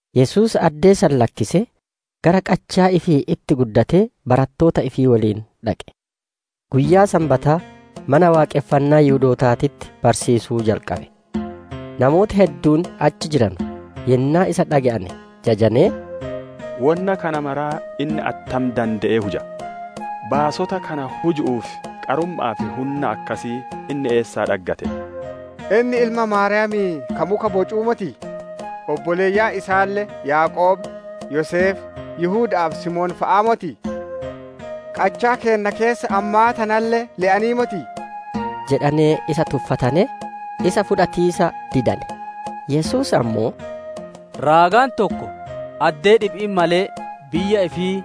Yesuus addee san lakkisee, gara qachaa ifii itti guddatee barattoota ifii woliin dhaqe. Guyyaa Sanbataa, Mana Waaqonfannaa Yihudootaatitti barsiisuu jalqabe. Namooti hedduun achi jiranu, yennaa isa dhage'ane jajanee, «Wonna kana mara inni attam dande'ee huja? Baasota kana huju'uuf qarumma'aa fi hunna akkasii inni eessaa dhaggate? Inni ilma Maariyaami'ii ka muka bocuu motii? Obboleeyyan isaalle Yaaqoob, Yoseef, Yihuda'aa fi Simoon fa'aa motii? Qachaa keenna keessa ammaa tanalle le'anii motii?» jedhanee isa tuffatanee, isa fudhatiisa didane. Yesuus ammoo, «Raagaan tokko, addee dhibi'itti malee, biyya ifii,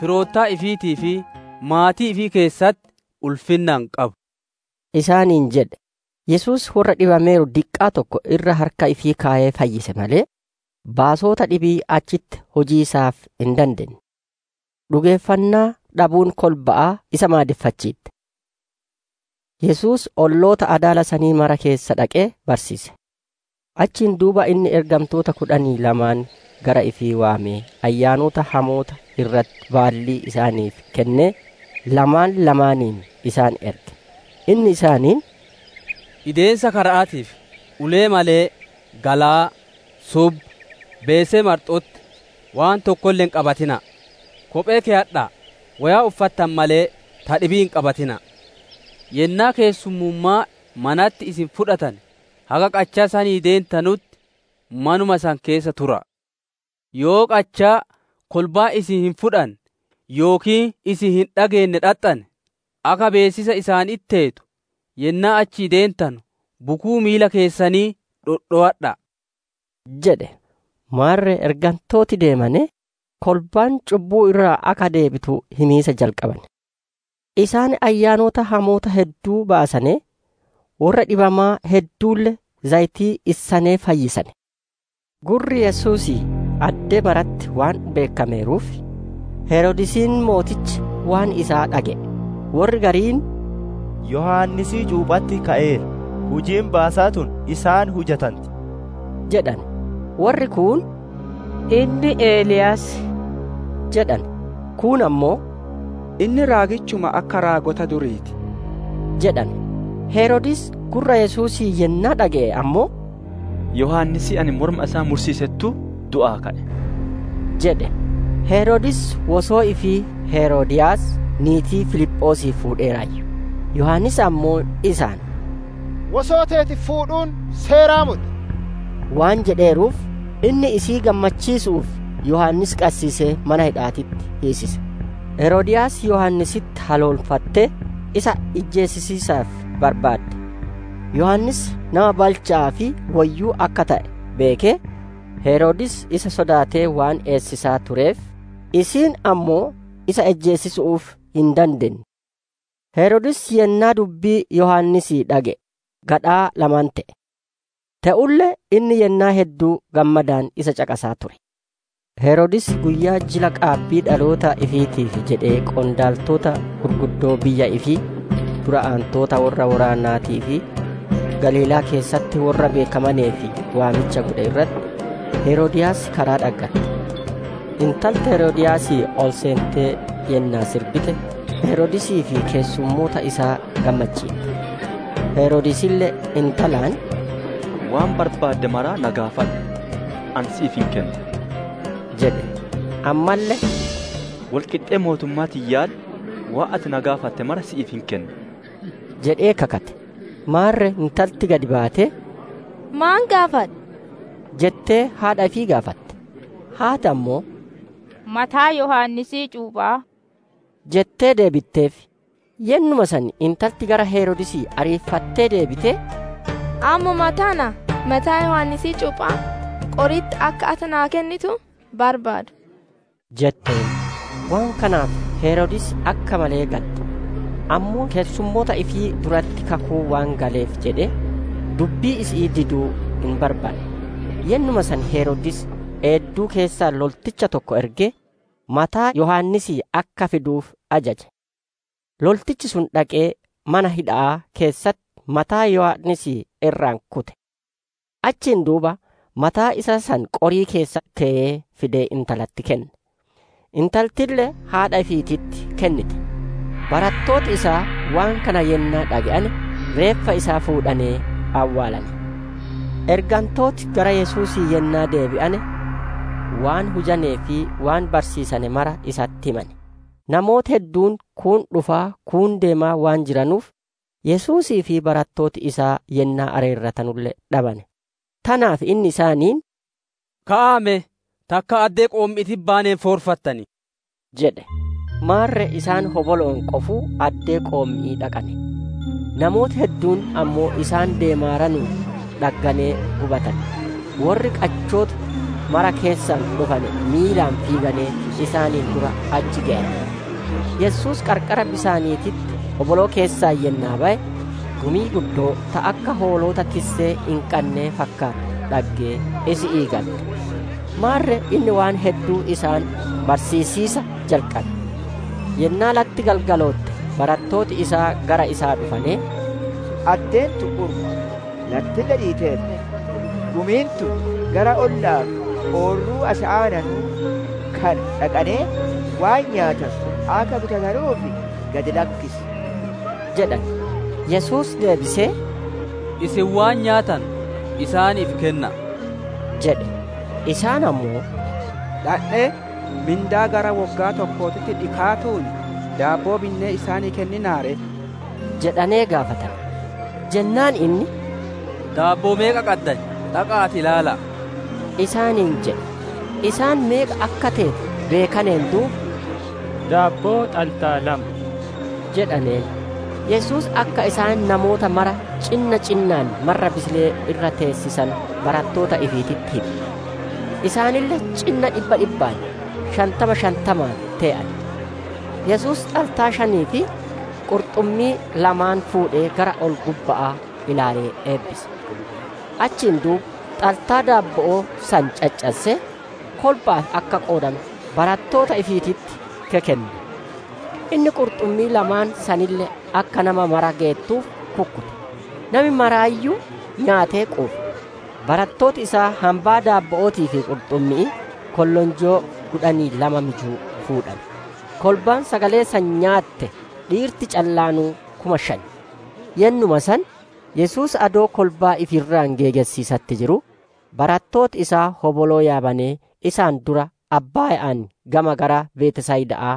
firoottan ifiitii fi maatii ifii keessatti ulfinna hin qabu» isaaniin jedhe. Yesuus worra dhibameeru diqqaa tokko irra harka ifii keyee fayyise malee, baasota dhibii achitti hujiisaaf hin dadeenne. Dhugeeffannaa dhabuun kolba'aa isa maadeffachiitte. Yesuus olloota adaala sanii mara keessa dhaqee barsiise. Achiin duuba inni ergantoota kudhanii lamaan gara ifii waamee ayyaanota hamoota irratti baallii isaaniif kennee, lamaan lamaaniin isaan erge. Inni isaaniin, «Ideemiisa kara'aatiif ulee malee, galaa, subba, beesee marxo'otti, waan tokkolle hin qabatina'a. Kophee keyadha'a; woyaa uffatane malee ta dhibii hin qabatina'a. Yennaa keessummummaa manatti isin fudhatane, haga qachaa sanii deentanutti manuma san keessa tura'a. Yoo qachaa kolbaan isin hin fudhanne yookiin isin hin dhageenne dhaxxane, akka beessisa isaanitti teetu yennaa achii deentanu bukuu miila keessanii dhodhowadha'a» jedhe. Maarre ergantooti deemanee, kolbaan cubbuu irraa akka deebitu himiisa jalqabane. Isaan ayyaanota hamoota hedduu baasanee, worra dhibamaa hedduulle zayitii issanee fayyisane. Gurri Yesuusii addee maratti waan beekkameeruuf, Heroodisiin mootichi waan isaa dhage'e. Worri gariin, «Yohaannisii cuupha'atti ka'eera; hujiin baasaa tun isaan hujanti» jedhane. Worri kuun, «Inni Eliyaas» jedhane; kuun ammoo, «Inni raagichuma akka raagota durii ti» jedhane. Heroodis gurra Yesuusii yennaa dhage'e ammoo, «Yohaannisii ani morma isaa mursiisettuu du'aa ka'e» jedhe. Heroodis wosoo ifii Heroodiyaas niitii Filiphoosii fuudheeraayyu. Yohaannis ammoo isaan, «Wosoo teeti fuudhuun seeraa moti!» waan jedheeruuf, inni isii gammachiisu'uuf, Yohaannis qassiisee mana hidha'aatitti hiisise. Heroodiyaas Yohaannisitti haloonfattee, isa ijjeesisiisaaf barbaadde. Yohaannis nama balcha'aa fi woyyuu akka te'e beekee, Heroodis isa sodaatee waan eessisaa tureef, isiin ammoo isa ijjeesiisu'uuf hin dandeenne. Heroodis yennaa dubbii Yohaannisii dhage'e gadhaa lama te'e. Te'ulle inni yennaa hedduu gammadaan isa caqasaa ture. Heroodis guyyaa jila qaabbii dhaloota ifiitiif jedhee qondaaltota gugurdoo biyya ifii, dura aantota worra woraanaatii fi Galiilaa keessatti worra beekkamaneef waamicha godhe irratti, Heroodiyaas karaa dhaggatte. Intalti Heroodiyaasii ol seentee yennaa sirbite, Heroodisii fi keessummoota isaa gammachiitte. Heroodisille intalaan, «Waan barbaadde mara na gaafadhu; ani si'iif hin kennaa!» jedhe. Ammalle, «Wol qixxee mootummaa tiyyaalle, waan ati na gaafatte mara si'iif hin kenna» jedhee kakate. Maarre intalti gad baatee, «Maan gaafadha?» jettee haadha ifii gaafatte. Haati ammoo, «Mataa Yohaannisii cuupha'aa» jettee deebiteef. Yennuma san intalti gara Heroodisii ariifattee deebitee, «Ammuma tana mataa Yohaannisii cuupha'aa qori'itti akka ati naaf kennitu barbaada» jetteen. Waan kanaaf Heroodis akka malee gadde; ammoo keessumoota ifii duratti kakuu waan galeef jedhee, dubbii isi'ii diduu hin barbaanne. Yennuma san Heroodis eedduu keessaa lolticha tokko ergee, mataa Yohaannisii akka fiduuf ajaje. Loltichi sun dhaqee mana hidha'aa keessatti mataa Yohaannisii irraa kute. Achiin duuba mataa isaa san qorii keessa keyee fidee intalatti kenne; intaltille haadha ifiititti kennite. Barattooti isaa waan kana yennaa dhage'ane reeffa isaa fuudhanee awwaalane. Ergantooti gara Yesuusii yennaa deebi'ane, waan hujanee fi waan barsiisane mara isatti himane. Namooti hedduun kuun dhufaa kuun deemaa waan jiranuuf, Yesuusii fi barattooti isaa yennaa areeratanulle dhabane. Tanaaf inni isaaniin, «Ka'aa me takkaa addee qoommi'iititti baaneen foorfattanii» jedhe. Maarre isaan hobolo'oon qofuu addee qoommi'ii dhaqane. Namooti hedduun ammoo isaan deemaaranuun dhagganee hubatane; worri qachoota mara keessaa dhufane miilaan fiiganee isaaniin dura achi geyane. Yesuus qarqara bisaaniititti hoboloo keessaa yennaa baye, gumii guddoo ta akka hoolota tissee hin qannee fakkaattu dhaggee isi'ii gadde. Maarre inni waan hedduu isaan barsiisiisa jalqabe. Yennaa latti galgalootte barattooti isaa gara isaa dhufanee, «Addeen tun urma, lattille dhiitteerti. Gumiin tun gara olla'aa fi oorruu as aananuu kana dhaqanee, waan nyaatanu akka bitatanuuf gad lakkisi!» jedhane. Yesuus deebisee, «Isin waan nyaatanu isaaniif kenna'a!» jedhe. Isaan ammoo, «Dhandhee mindaa gara woggaa tokkootitti dhikaatuun daabboo binnee isaanii kenninaa ree?» jedhanee gaafatane. Jennaan inni, «Daabboo meeqa qaddan? Dhaqa'aatii ilaala'a!» isaaniin jedhe. Isaan meeqa akka teete beekaneen duuba, «Daabboo xaltaa lama» jedhaneen. Yesuus akka isaan namoota maraa cinna cinnaan marra bisilee irra teessisanu barattoota ifiititti hime. Isaanille cinna dhibba dhibbaan, shantama shantamaan tee'ane. Yesuus xaltaa shanii fi qurxummii lamaan fuudhee gara ol-gubba'aa ilaalee eebbise. Achiin duuba xaltaa daabbo'oo san caccassee, kolba'aaf akka qoodanu barattoota ifiititti kekenne. Inni qurxummii lamaan sanille akka nama mara geettuuf kukkute. Nami maraayyuu nyaatee quufe. Barattooti isaa hambaa daabbo'ootii fi qurxummi'ii kollonjoo kudhanii lama mijuu fuudhane. Kolbaan sagalee san nyaatte dhiirti callaanuu kuma shan. Yennuma san, Yesuus adoo kolbaa ifi irraa geegessiisatti jiruu, barattooti isaa hoboloo yaabanee isaan dura abbaaya'aan gama gara Betsayida'aa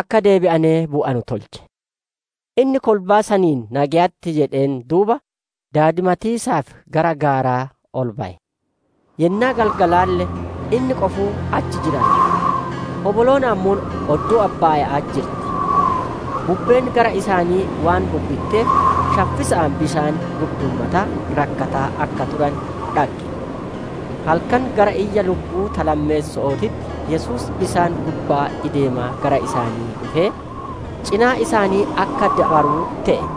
akka deebi'anee bu'anu tolche. Inni kolbaa saniin nageyatti jedheen duuba daadimatiisaaf gara gaaraa ol baye. Yennaa galgalaalle inni qofuu achi jiraayyu; hoboloon ammoo odduu abbaaya'aa jirti. Bubbeen gara isaanii waan bubbitteef, shaffisa'aan bisaan gurduummataa rakkataa akka turane dhagge. Halkan gara iyya lukku'uu ta lammeesso'ootitti Yesuus bisaan gubbaa ideemaa gara isaanii dhufee, cinaa isaanii akka dabaruu te'e.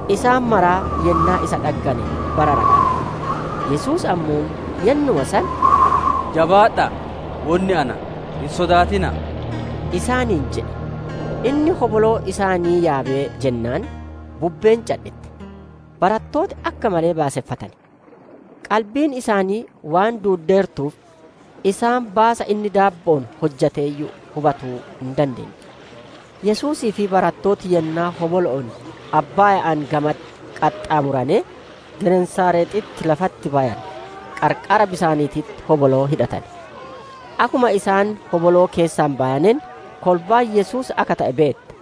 Isaan maraa yennaa isa dhaggane bararaqane. Yesuus ammoo yennuma san, «Jabaadha'a! Wonni Ana; hin sodaatina'a!» isaaniin jedhe. Inni hoboloo isaanii yaabee jennaan, bubbeen cadhitte. Barattooti akka malee baaseffatane. Qalbiin isaanii waan duuddeertuuf, isaan baasa inni daabbo'oon hojjateeyyuu hubatuu hin dandeenne. Yesuusii fi barattooti yennaa hobolo'oon abbaaya'aan gamatti qaxxaamuranee, Genesaarexitti lafatti bayane, qarqara bisaaniititti hoboloo hidhatane. Akkuma isaan hoboloo keessaa bayaneen, kolbaan Yesuus akka te'e beette.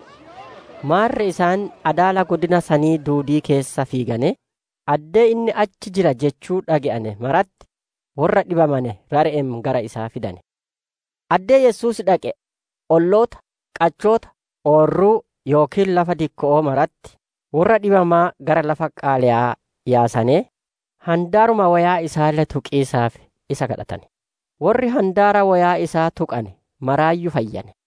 Maarre isaan adaala godina sanii duudii keessa fiiganee, addee inni achi jira jechuu dhage'ane maratti, worra dhibamane rare'een gara isaa fidane. Addee Yesuus dhaqe, olloota, qachoota, oorruu yookiin lafa dikko'oo maratti, worra dhibamaa gara lafa qaaleyaa yaasanee, handaaruma woyaa isaalle tuqiisaaf isa kadhatane. Worri handaara woyaa isaa tuqane maraayyuu fayyane.